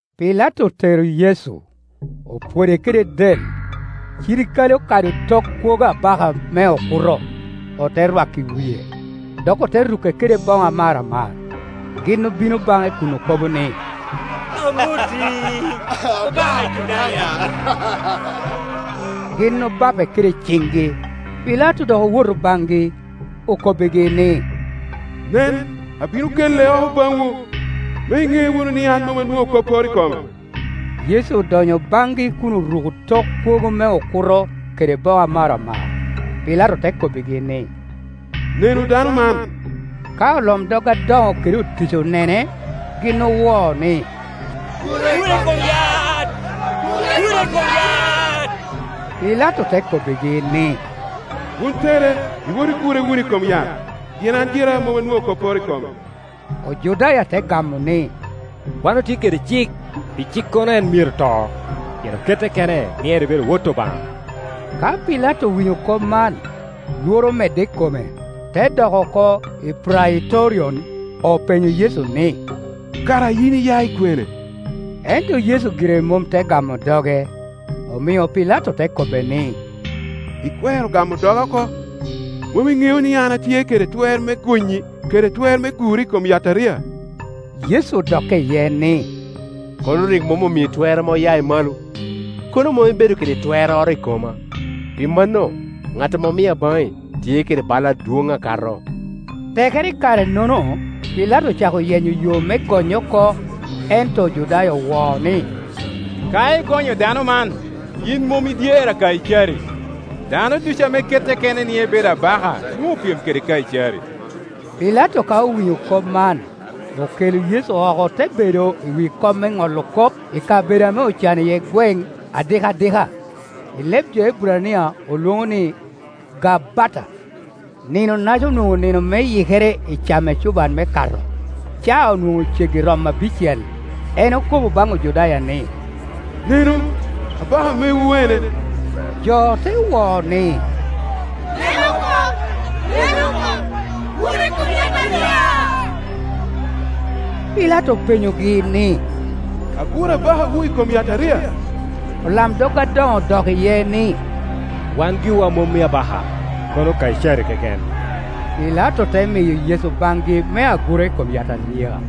Pilato otero Yecu, opwode kede del. Cirikale okado tok kwogo abaka me okuto, ote rwako i wie, dok ote ruke kede boŋo amaramar. Gin obino baŋe kun okobo ni, “Amoti, abaka Ojudaya!” Gin obape kede ciŋgi. Pilato dok owoto baŋgi, okobbigi ni, “Nen, abino ke le oko baŋwu, me iŋe wunu ni an mom anwoŋo kopporo i kome.” Yecu odonyo baŋgi kun oruko tok kwogo me okuto kede boŋo amaramar. Pilato te k obbigi ni, “Nenu dano man.” Ka olamdog adoŋo kede otic onene, gin owo ni, “Gure i kom yat! Gure i kom yat!” Pilato te kobbigi ni, “Wun tere, iwot igure wunu i kom yat, pien an gira mom anwoŋo kopporo i kome.” Ojudaya te gamo ni, “Wan otye kede cik; pi cikkono, en myero to, pien okette kene ni en ebedo Wot Obaŋa.” Ka Pilato owinyo kop man, lworo omedde i kome, te dok oko i Praitorion, openyo Yecu ni, “Kara yin iya i kwene?” Ento Yecu gire mom te gamo doge. Omio Pilato te kobbe ni, “Ikwero gamo doga oko? Mom iŋeo ni an atye kede twer me gonyi, kede twer me guri i kom yataria?” Yecu odokke iye ni, “Kono rik mom omii twer ame oya i malo, kono mom ibedo kede twerroro i koma; pi mano, ŋat ame omia baŋi tye kede bai adwoŋ akato.” Tekere i kare-nono, Pilato ocako yenyo yo me gonye oko, ento Ojudaya owo ni, “Ka igonyo dano man, yin mom idyere a Kaicari. Dano ducu ame kette kene ni ebedo abaka nwoŋo opyem kede Kaicari.” Pilato ka owinyo kop man, okelo Yecu oko te bedo i wi kom me ŋolo kop i kabedo ame ocano iye gweŋ adikadika; i leb jo Eburania olwoŋo ni, Gabbata. Ninonaca onwoŋo nino me Yikere i camo ecuban me Kato; caa onwoŋo ceggi romo abicel. En okobo baŋ Ojudaya ni, “Nenu, abaka mewu ene!” Jo te wo ni, “Neke oko! Neke oko! Gure i kom yataria!” Pilato openyogi ni, “Agur abakawu i kom yataria?” Olamdog adoŋo odok iye ni, “Wan giwa omom i abaka, kono Kaicari keken.” Pilato te miyo Yecu baŋgi me agura i kom yataria.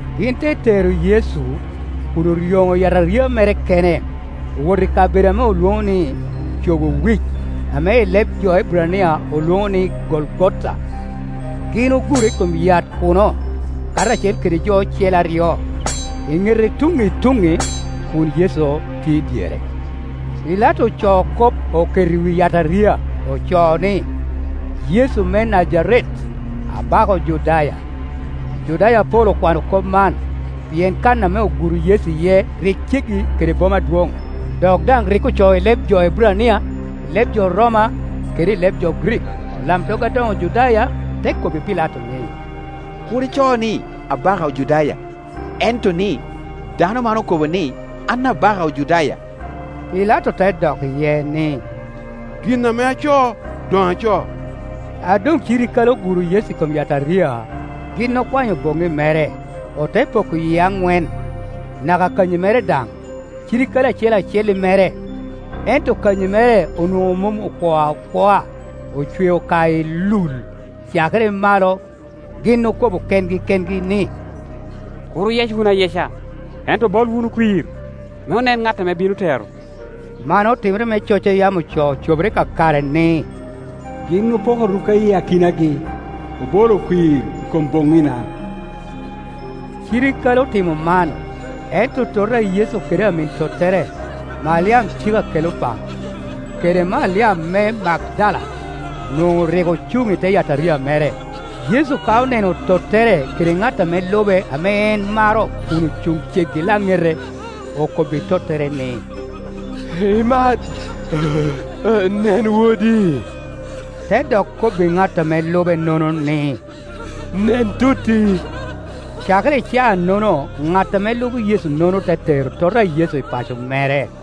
Gin te tero Yecu, kun oryoŋo yataria mere kene, owoto i kabedo ame olwoŋo ni, Cogo Wic, ame i leb jo Eburania olwoŋo ni, Golgota. Gin ogure i kom yat kuno, karacel kede jo ocele aryo, i nete tuŋŋi i tuŋŋi, kun Yecu tye i dyere. Pilato ocoo kop oketo i wi yataria; ocoo ni, “Yecu me Najaret, abaka Ojudaya.” Ojudaya apol okwano kop man, pien kan ame oguro Yecu iye rik ceggi kede boma adwoŋ, dok daŋ rik ocoo i leb jo Eburania, i leb jo Roma kede i leb jo Grik. Olamdog adoŋo Ojudaya te kobbi Pilato ni, “Kur ico ni, ‘Abaka Ojudaya’, ento ni, ‘Dano man okobo ni, An Abaka Ojudaya.’” Pilato te dok iye ni, “Gin ame acoo, doŋ acoo.” A doŋ cirikale oguro Yecu i kom yataria, gin okwanyo boŋŋi mere, ote poko yie aŋwen, naka kanyi mere daŋ, cirikale acel acel i mere. Ento kanyi mere onwoŋo mom okwoo akwoa; ocweo ka ilul, cakere i malo. Gin okobo kengi kengi ni, “Kur oyec wunu ayeca, ento obol wunu kwir, me onen ŋat ame bino tero.” Man otimere me coc a yam ocoo cobere kakare ni, “Gin opoko rukka i akinagi, obolo kwir i kom boŋina.” Cirikale otimo man, ento tota a Yecu kede amin tottere, Maliam cik a Kelopa, kede Maliam me Magdala, onwoŋo rik ocuŋ i te yataria mere. Yecu ka oneno tottere kede ŋat ame lube ame en maro kun ocuŋ ceggi i laŋete, okobbi tottere ni, “Imat, nen wodi!” Te dok kobbi ŋat ame lubenono ni, “Nen totti!” Cakere i caa-nono ŋat ame lubo Yecu-nono te tero tota a Yecu i paco mere.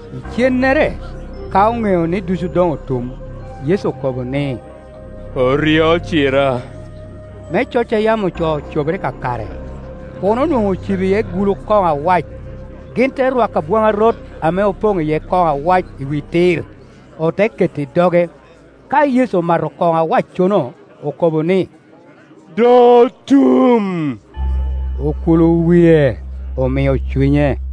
Icennere, ka oŋeo ni ducu doŋ otum, Yecu okobo ni, “Oryo ocira,” me coc a yam ocoo cobere kakare. Kuno onwoŋo ocibo iye gulu koŋo awac; gin te rwako abwaŋarot ame opoŋ iye kono awac i wi tir, ote keto i doge. Ka Yecu omato kono awaccono, okobbo ni, “Doŋ otum”; akula wie, omio cunye.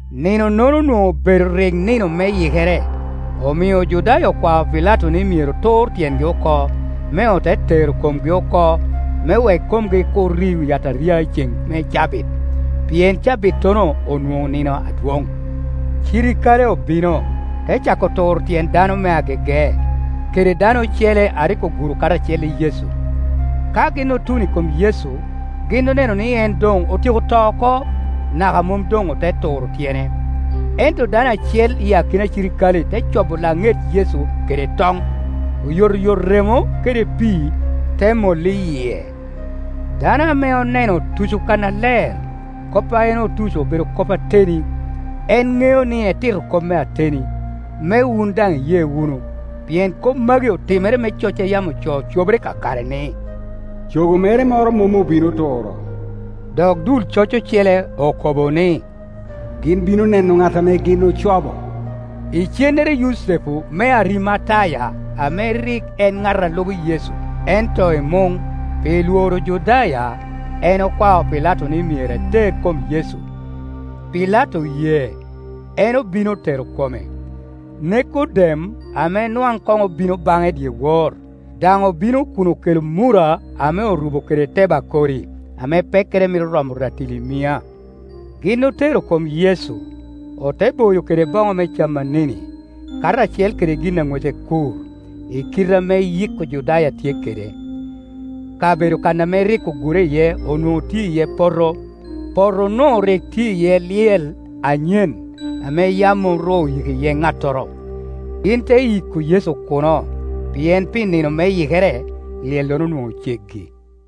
Nino-nono onwoŋo obedo rik nino me Yikere, omio Ojudaya okwao Pilato ni myero tur tyengi oko, me ote tero komgi oko; me wek komgi kur ri i wi yataria i ceŋ me cabit, pien cabittono onwoŋo nino adwoŋ. Cirikale obino, te cako turo tyen dano me agege, kede dano ocele a rik oguro karacel i Yecu. Ka gin otuno i kom Yecu, gin oneno ni en doŋ otyeko to oko, naka mom doŋ ote turo tyene. Ento dano acel i akina cirikale te cobo laŋet Yecu kede toŋ; oyotoyot remo kede pi i te mollo i yie. Dano ame oneno otuco kannaler, kop a en otuco obedo kop ateni; en ŋeo ni etito kop me ateni, me wun daŋ iye wunu. Pien kop magi otimere me coc a yam ocoo cobere kakare ni, “Cogo mere moro mom obino turo.” Dok dul coc ocele okobo ni, “Gin bino neno ŋat ame gin ocobo.” Icennere Yucepu me Arimataya, ame rik en ŋat a lubo Yecu, ento i muŋ, pi lworo Ojudaya, en okwao Pilato ni myero eter kom Yecu; Pilato oye. En obino otero kome. Nekodem, ame nwaŋ koŋ obino baŋe dyewor, daŋ obino kun okelo murra ame orubo kede tebakori, ame pekkere mito romo ratili mia. Gin otero kom Yecu, ote boyo kede boŋo me camanini, karacel kede gin a ŋwece kur, i kite ame yik Ojudaya tye kede. Kabedo kan ame rik ogure iye onwoŋo tye iye poto, potonu rik tye iye lyel anyen, ame yam mom ru oyiko iye ŋattoro. Gin te yiko Yecu kuno, pien pi nino me Yikere, lyellono onwoŋo ceggi.